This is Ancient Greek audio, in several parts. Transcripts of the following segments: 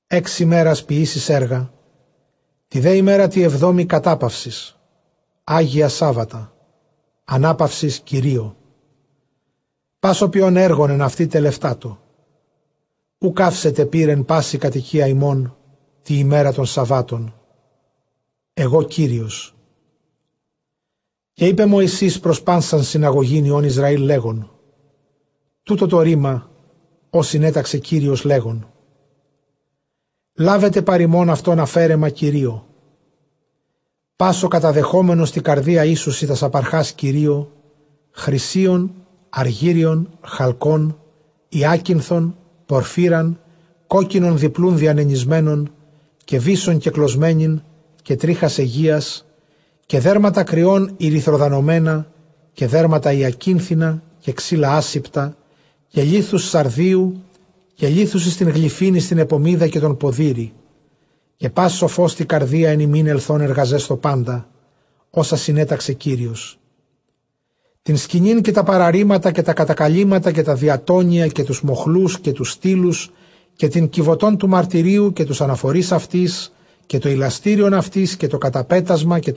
Ἓξ ἡμέρας ποιήσεις ἔργα, τῇ δὲ ἡμέρᾳ τῇ ἑβδόμῃ κατάπαυσις· ἅγια, σάββατα· ἀνάπαυσις Κυρίῳ· πᾶς ὁ ποιῶν ἔργον ἐν αὐτῇ, τελευτάτω. Οὐ καύσετε πῦρ ἐν πάσῃ κατοικίᾳ ὑμῶν τῇ ἡμέρᾳ τῶν σαββάτων· ἐγὼ Κύριος. Καὶ εἶπε Μωυσῆς πρὸς πᾶσαν συναγωγὴν υἱῶν Ἰσραὴλ, λέγων, τοῦτο τὸ ῥῆμα, ὃ συνέταξε Κύριος, λέγων, λάβετε παρʼ ὑμῶν αὐτῶν ἀφαίρεμα Κυρίῳ· πᾶς ὁ καταδεχόμενος τῇ καρδίᾳ, οἴσουσι τὰς ἀπαρχὰς Κυρίῳ, χρυσίον, ἀργύριον, χαλκὸν, ὑάκινθον, πορφύραν, κόκκινον διπλοῦν διανενησμένον, καὶ βύσσον κεκλωσμένην, καὶ τρίχας αἰγείας, καὶ δέρματα κριῶν ἠρυθροδανωμένα, καὶ δέρματα ὑακινθινα, καὶ ξύλα ἄσηπτα, καὶ λίθους σαρδίου, καὶ λίθους εἰς τὴν γλυφὴν εἰς τὴν ἐπωμίδα καὶ τὸν ποδήρη. Καὶ πᾶς σοφὸς τῇ καρδίᾳ ἐν ὑμῖν, ἐλθὼν ἐργαζέσθω πάντα ὅσα συνέταξε Κύριος· Τὴν σκηνὴν, καὶ τὰ παραρύματα, καὶ τὰ κατακαλύμματα, καὶ τὰ διατόνια, καὶ τοὺς μοχλοὺς, καὶ τοὺς στύλους, καὶ τὴν κιβωτὸν τοῦ μαρτυρίου, καὶ τοὺς ἀναφορεῖς αὐτῆς, καὶ τὸ ἱλαστήριον αὐτῆς, καὶ τὸ καταπέτασμα,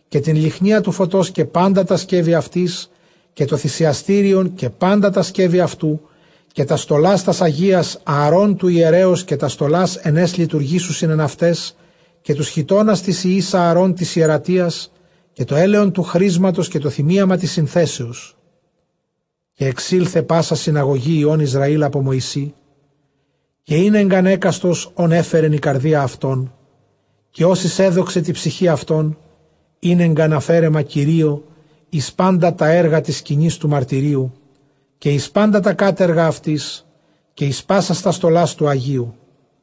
καὶ τὴν λυχνίαν τοῦ φωτὸς καὶ πάντα τὰ σκεύη αὐτῆς, καὶ τὸ θυσιαστήριον καὶ πάντα τὰ σκεύη αὐτοῦ, καὶ τὰς στολὰς τὰς ἁγίας Ἀαρὼν τοῦ ἱερέως, καὶ τὰς στολὰς ἐν αἷς λειτουργήσουσιν ἐν αὐταῖς, καὶ τοὺς χιτῶνας τοῖς υἱοῖς Ἀαρὼν τῆς ἱερατίας, καὶ τὸ ἔλαιον τοῦ χρίσματος, καὶ τὸ θυμίαμα τῆς συνθέσεως. Καὶ ἐξῆλθε πᾶσα συναγωγὴ υἱῶν Ἰσραὴλ ἀπὸ Μωυσῆ. Καὶ ἤνεγκαν ἕκαστος, ὧν ἔφερεν ἡ καρδία αὐτῶν, καὶ ὅσοις ἔδοξε τῇ ψυχῇ αὐτῶν, ἀφαίρεμα· καὶ ἤνεγκαν ἀφαίρεμα Κυρίῳ εἰς πάντα τὰ ἔργα τῆς σκηνῆς τοῦ μαρτυρίου, καὶ εἰς πάντα τὰ κάτεργα αὐτῆς καὶ εἰς πάσας τὰς στολὰς τοῦ ἁγίου.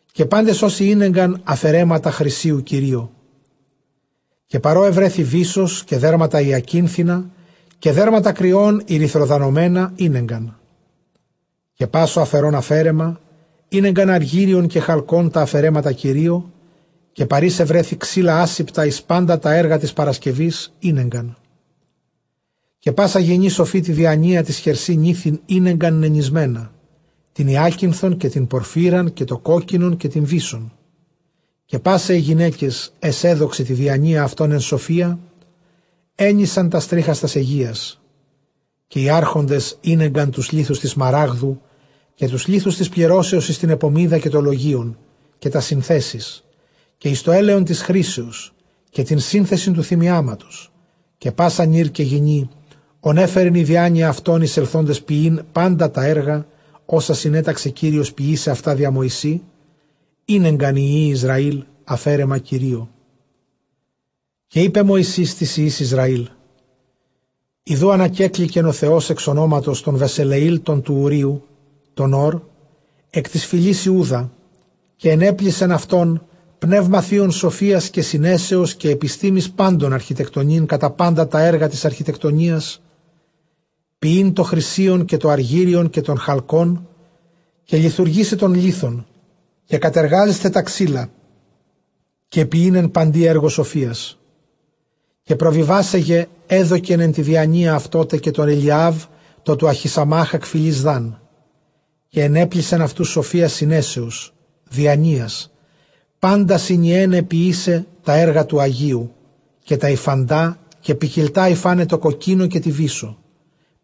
Καὶ πάντες ὅσοι ἤνεγκαν ἀφαιρέματα χρυσίου Κυρίῳ, καὶ παρʼ ᾧ εὑρέθη βύσσος· καὶ δέρματα ὑακίνθινα καὶ δέρματα κριῶν ἠρυθροδανωμένα ἤνεγκαν. Καὶ πᾶς ὁ ἀφαιρῶν ἀφαίρεμα, ἤνεγκαν ἀργύριον καὶ χαλκὸν, τὰ ἀφαιρέματα Κυρίῳ· καὶ παρʼ οἷς εὑρέθη ξύλα ἄσηπτα· καὶ εἰς πάντα τὰ ἔργα τῆς παρασκευῆς ἤνεγκαν. Καὶ πᾶσα γυνὴ σοφὴ τῇ διανοίᾳ ταῖς χερσὶ νήθειν, ἤνεγκαν νενησμένα, τὴν ὑάκινθον, καὶ τὴν πορφύραν, καὶ τὸ κόκκινον, καὶ τὴν βύσσον. Καὶ πᾶσαι αἱ γυναῖκες, αἷς ἔδοξε τῇ διανοίᾳ αὐτῶν ἐν σοφίᾳ, ἔνησαν τὰς τρίχας τὰς αἰγείας. Καὶ οἱ ἄρχοντες ἤνεγκαν τοὺς λίθους τῆς σμαράγδου, καὶ τοὺς λίθους τῆς πληρώσεως εἰς τὴν ἐπωμίδα, καὶ τὸ λογεῖον, καὶ τὰς συνθέσεις, καὶ εἰς τὸ ἔλαιον τῆς χρίσεως, καὶ τὴν συνθεσιν τοῦ θυμιάματος. Καὶ πᾶς ἀνὴρ καὶ γυνὴ, ὧν ἔφερεν ἡ διάνοια αὐτῶν εἰσελθόντας ποιεῖν πάντα τὰ ἔργα, ὅσα συνέταξε Κύριος ποιῆσαι αὐτὰ διὰ Μωυσῆ, ἤνεγκαν οἱ υἱοὶ Ἰσραὴλ, ἀφαίρεμα Κυρίῳ. Καὶ εἶπε Μωυσῆς τοῖς υἱοῖς Ἰσραὴλ, Ἰδοὺ ἀνακέκληκεν ὁ Θεὸς ἐξ ὀνόματος τὸν Βεσελεὴλ τὸν τοῦ Οὐρείου τὸν Ὢρ, ἐκ τῆς φυλῆς Ἰούδα, καὶ ἐνέπλησεν αὐτὸν πνεῦμα θεῖον σοφίας καὶ συνέσεως, καὶ ἐπιστήμης πάντων, ἀρχιτεκτονεῖν κατὰ πάντα τὰ ἔργα τῆς ἀρχιτεκτονίας, ποιεῖν τὸ χρυσίον καὶ τὸ ἀργύριον καὶ τὸν χαλκόν, καὶ λιθουργῆσαι τὸν λίθον, καὶ κατεργάζεσθαι τὰ ξύλα, καὶ ποιεῖν ἐν παντὶ ἔργῳ σοφίας. Καὶ προβιβάσαι γε ἔδωκεν ἐν τῇ διανοίᾳ αὐτῷ τε, καὶ τῷ Ἐλιὰβ τῷ τοῦ Ἀχισαμὰκ, ἐκ φυλῆς Δάν· Καὶ ἐνέπλησεν αὐτοὺς σοφίας, συνέσεως, διανοίας, πάντα συνιέναι ποιῆσαι τὰ ἔργα τοῦ ἁγίου, καὶ τὰ ὑφαντὰ καὶ ποικιλτὰ ὑφάναι τῷ κοκκίνῳ, καὶ τῇ βύσσῳ,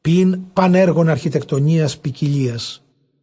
ποιεῖν πᾶν ἔργον ἀρχιτεκτονίας, ποικιλίας.